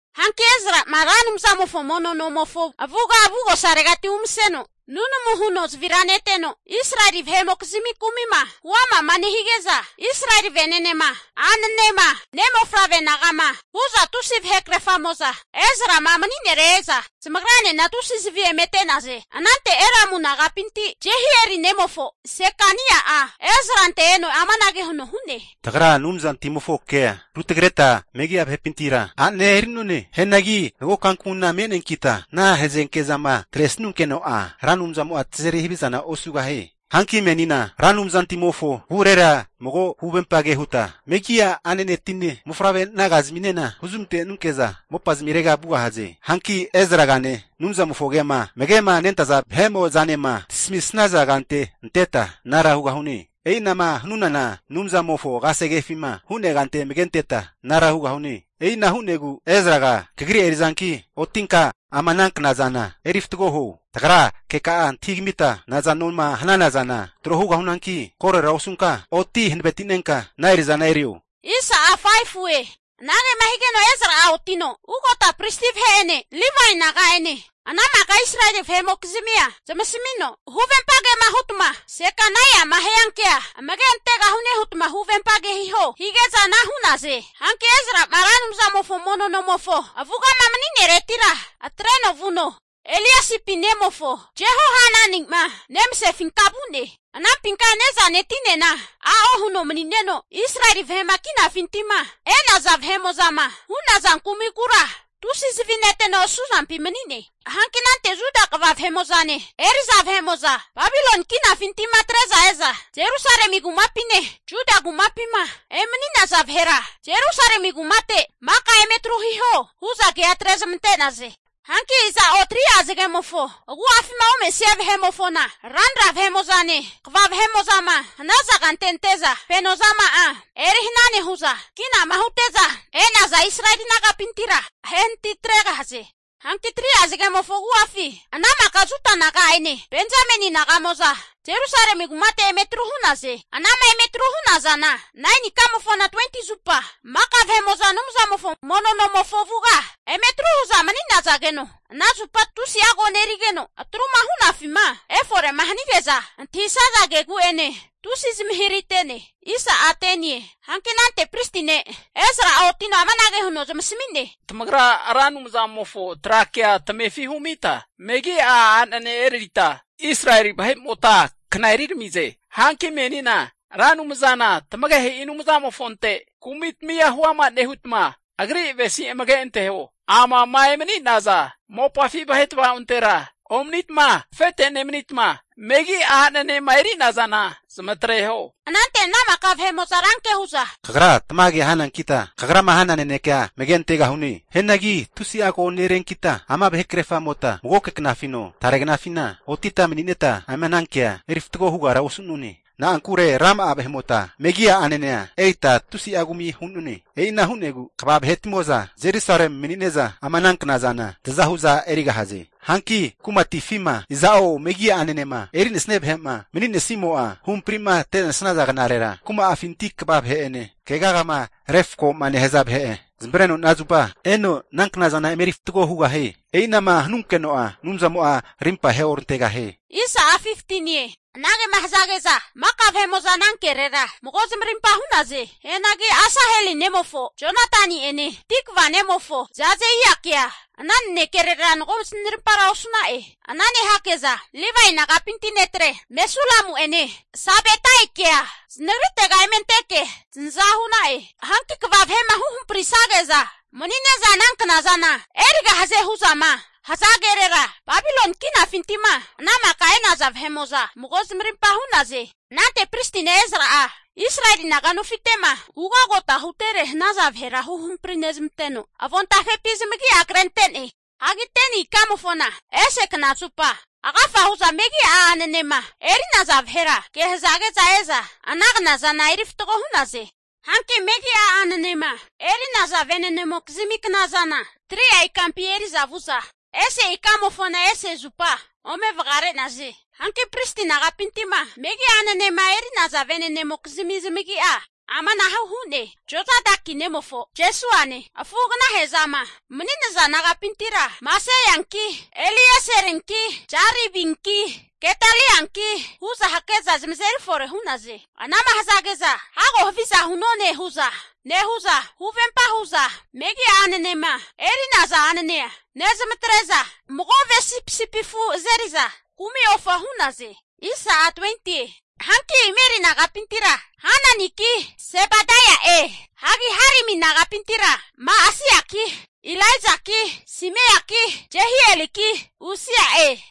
Hanki Ezra'a Ra Anumzamofo mono nomofo avuga, avugosaregati umaseno nunamu nehuno zavira neteno Israeli vahe'mokizmi kumi'ma huama'ma nehige'za, Israeli vene'nema a'nanema ne' mofavre naga'ma hu'za tusi'a vahekerfamo'za Ezra'ma mani'nere e'za, zamagranena tusi zavi emete'naze. Anante Elamu nagapinti Jehieli nemofo Sekania'a Ezrante eno amanage huno hu'ne, Tagra Anumzantimofo kea rutagreta megi'a vahepintira a'nea eri'none. Hianagi mago kankamuna me'neankita ana hazenke zama atresanunkeno'a, Ra Anumzamo'a tazeri havizana osugahie. Hanki menina Ra Anumzantimofo avure mago huvempa ke huta, megi'a a'nanetine mofavre naga'zaminena huzmantenunke'za mopa zamirega vugahaze. Hanki Ezragane Anumzamofo ke'ma amage'ma nentaza vahe'mo'zanema tasamisnaza kante anteta anara hugahune. E'inahu'ma hanunana Anumzamofo kasegefima hu'nea kante amage anteta anara hugahune. E'ina hu'negu Ezraga kagri eri'zanki otinka ama ana knazana eri fatgo huo. Tagra keka'a antahigamita nazanoma hanana zana tro hugahunanki, korora osunka oti hanavetinenka ana eri'za erio. Anagema higeno Ezra'a otino ugota pristi vahe'ene Livae naga'ene ana maka Israeli vahe'mokizmia zamasamino, Huvempa kema hutma Sekania'ma hia kea amage antegahune hutma huvempa hiho hige'za ana hu'naze. Hanki Ezra'ma Ra Anumzamofo mono nomofo avugama mani'neretira atreno vuno, Eliasipi nemofo Jehohanani'ma nemasefinka vu'ne. Anampinka ne'zane tinena a'o huno mani'neno, Israeli vahe'ma kinafintima e'naza vahe'mo'zama hu'naza kumikura tusi zavi neteno asuzampi mani'ne. Hanki anante Juda kva vahe'mo'zane eri'za vahe'mo'zanema Babiloni kinafinti'ma atre'za e'za Jerusalemi kumapine Juda kumapima emani'naza vahera, Jerusalemi kumate maka eme tru hiho, hu'za kea atre'zmante'naze. Hanki iza'o 3'a zagemofo agu'afima omesia vahe'mofona, ranra vahe'mo'zane kva vahe'mo'zama hanaza kante ante'za, fenozama'a eri hana nehu'za, kinama hute'za e'naza Israeli naga'pintira ahenatitregahaze. Hanki 3'a zagemofo agu'afi ana maka Juda naga'ene Benjamini naga'moza Jerusalemi kumate eme tru hu'naze. Ana'ma eme atru hu'nazana 9ni ikamofona 20ti zupa maka Anumzamofo mono nomofo avuga eme atru hu'za mani'nazageno, ana zupa tusi'a ko nerigeno, atru'ma hu'nafima efore'ma hanige'za antahisaza kegu'enena tusi zamahirahite'ne. Hanki anante pristi ne' Ezra'a otino amanage huno zamasami'ne, Tamagra Ra Anumzamofo tra kea tamefi humita, megi'a a'nanea erita Israeli vahe'mota kna eriramize. Hanki menina Ra Anumzana tamagehe'i Anumzamofonte kumitamia huama nehutma, Agri avesi'za amage anteho. Amama emani'naza mopafi vahe tvaontera omanitma afete nemanitma, megi'a a'nanema eri'nazana zamatreho. Anante ana maka vahe'mo'za ranke hu'za, Kagra tamage hanankita kagrama hana nanekea amage antegahune. Hianagi tusi'a koneriankita ama vahe krerfamota magoke knafino tare knafina otita manineta ama ana kea eri fatgo hugara osu'none. Na'ankure rama'a vahe'mota megi'a a'nanea erita tusi'a kumi hu'none. E'ina hu'negu kva vahetimo'za Jerusalemi mani'neza ama ana knazana taza hu'za erigahaze. Hanki kumatifima iza'o megi'a a'nanema eri'nesia vahe'ma mani'nesimo'a, huhampri'ma ante'nesaza knarera, kuma'afinti kva vahe'ene keagama refko'ma nehaza vahe'ene zamavare'neno ana zupa eno ana knazana emeri fatgo hugahie. E'inama hanunkeno'a Anumzamo'a arimpa aheorantegahie. Anage'ma hazage'za maka ana kerera mago zamarimpa hu'naze. Hianagi Asaheli nemofo Jonatani'ene Tikva nemofo Jazeiakea ana nanekerera mago zanarimpa osu'na'e. Ana nehake'za Livae nagapinti netre Mesulamu'ene Sabetaikea zanagritega eme anteke zanaza hu'na'e. Hanki kva vahe'ma huhamprisage'za mani'neza ana knazana erigahaze hu'zama haza kerera, Babiloni kinafinti'ma ana maka e'naza vahe'mo'za mago zamarimpa hu'naze. Anante pristi ne' Ezra'a, Israeli naga nofite'ma ugagota hutere hanaza vahera huhampri nezmanteno, avontafepi zamagi'a krente'ne. Hagi 10ni ikamofona ese knazupa agafa hu'za megi'a a'nanema eri'naza vahera ke hazage'za e'za ana knazana eri fatgo hu'naze. Hanki megi'a a'nanema eri'naza ve'nenemokizmi knazana 3'a ikampi eri'za vu'za, ese ikamofona ese zupa ome vagare'naze. Hanki pristi nagapinti'ma megi'a a'nanema eri'naza ve'nenemokizmi zamagi'a amanahu hu'ne, Jozadaki nemofo Jesuane afu'agna he'zama mani'naza nagapintira, Maseianki Elieserinki Jaribinki Gedalianki hu'za hake'za zamazeri fore hu'naze. Anama hazage'za hago haviza hu'none hu'za nehu'za huvempa hu'za megi'a a'nanema eri'naza a'nanea nezmatre'za, mago ve sipisipi afu azeri'za kumi ofa hu'naze. Hanki Imeri nagapintira Hananiki Sebadaia'e. Hagi Harimi nagapintira Ma'aseiaki Ilaijaki Simaiaki Jehieliki Usia'e.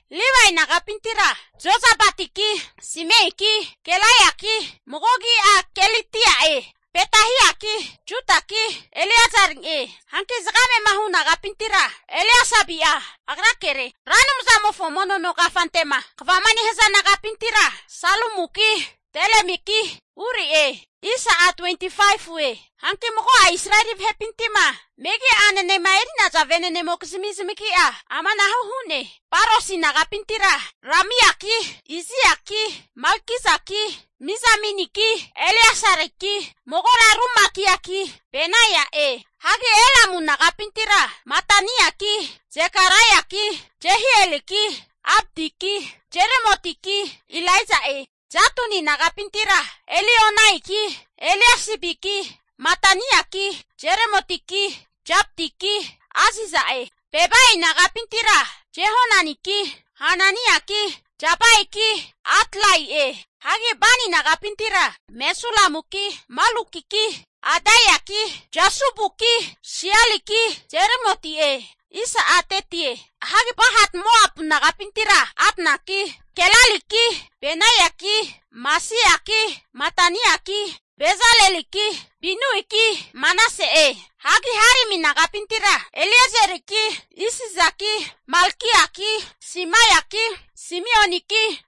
Livae nagapintira Jozabadiki Simeiki Kelaiaki (mago agi'a Kelita'e) Petahiaki Judaki Eliezeri'e. Hanki zagame'ma hu nagapintira Eliasibi'a agrakere. Ra Anumzamofo mono no kafante'ma kvama nehaza nagapintira Salumuki Telemiki Uri'e. Hanki mago'a Israeli vahepinti'ma megi'a a'nanema eri'naza ve'nenemokizmi zamagi'a amanahu hu'ne. Parosi nagapintira Ramiaki Iziaki Malkijaki Mijaminiki Eleasariki magora ru Makiaki Benaia'e. Hagi Elamu nagapintira Mataniaki Zekaraiaki Jehieliki Abdiki Jeremotiki Elaija'e. Zatuni nagapintira Elioenaiki Eliasibiki Mataniaki Jeremotiki Zabadiki Aziza'e. Bebai nagapintira Jehohananiki Hananiaki Zabaiki Atlai'e. Hagi Bani nagapintira Mesulamuki Malukiki Adaiaki Jashubuki Sialiki Jeremoti'e. Hagi Pahat-Moapu nagapintira Adnaki Kelaliki Benaiaki Maseiaki Mataniaki Bezaleliki Binuiki Manase'e. Hagi Harimi nagapintira Eliezeriki Isijaki Malkiaki Simaiaki Simioniki,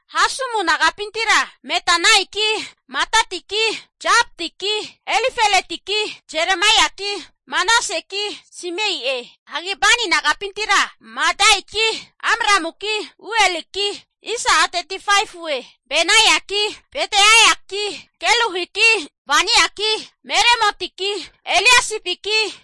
Hasumu nagapintira Matenaiki Matataki Zabadiki Elifeletiki Jeremaiaki Manaseki Simei'e. Hagi Bani nagapintira Madaiki Amramuki Ueliki, Benaiaki Bedeiaki Keluhiki, Vaniaki Meremotiki Eliasibiki,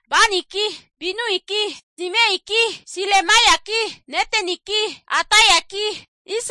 Baniki Binuiki Simeiki, Silemiaki Neteniki Adaiaki,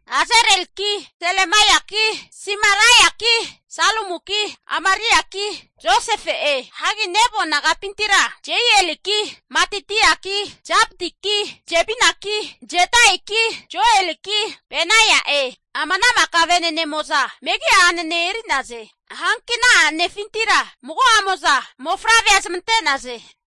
Azareliki Silemiaki Simariaki, Salumuki Amariaki Josefe'e. Hagi Nebo nagapintira Jeieliki Matitiaki Zabadiki Zebinaki Jadaiki Joeliki Benaia'e. Ama ana maka ve'nenemo'za megi'a a'nane eri'naze. Hanki ana a'nefintira mago'amo'za mofavrea zamante'naze.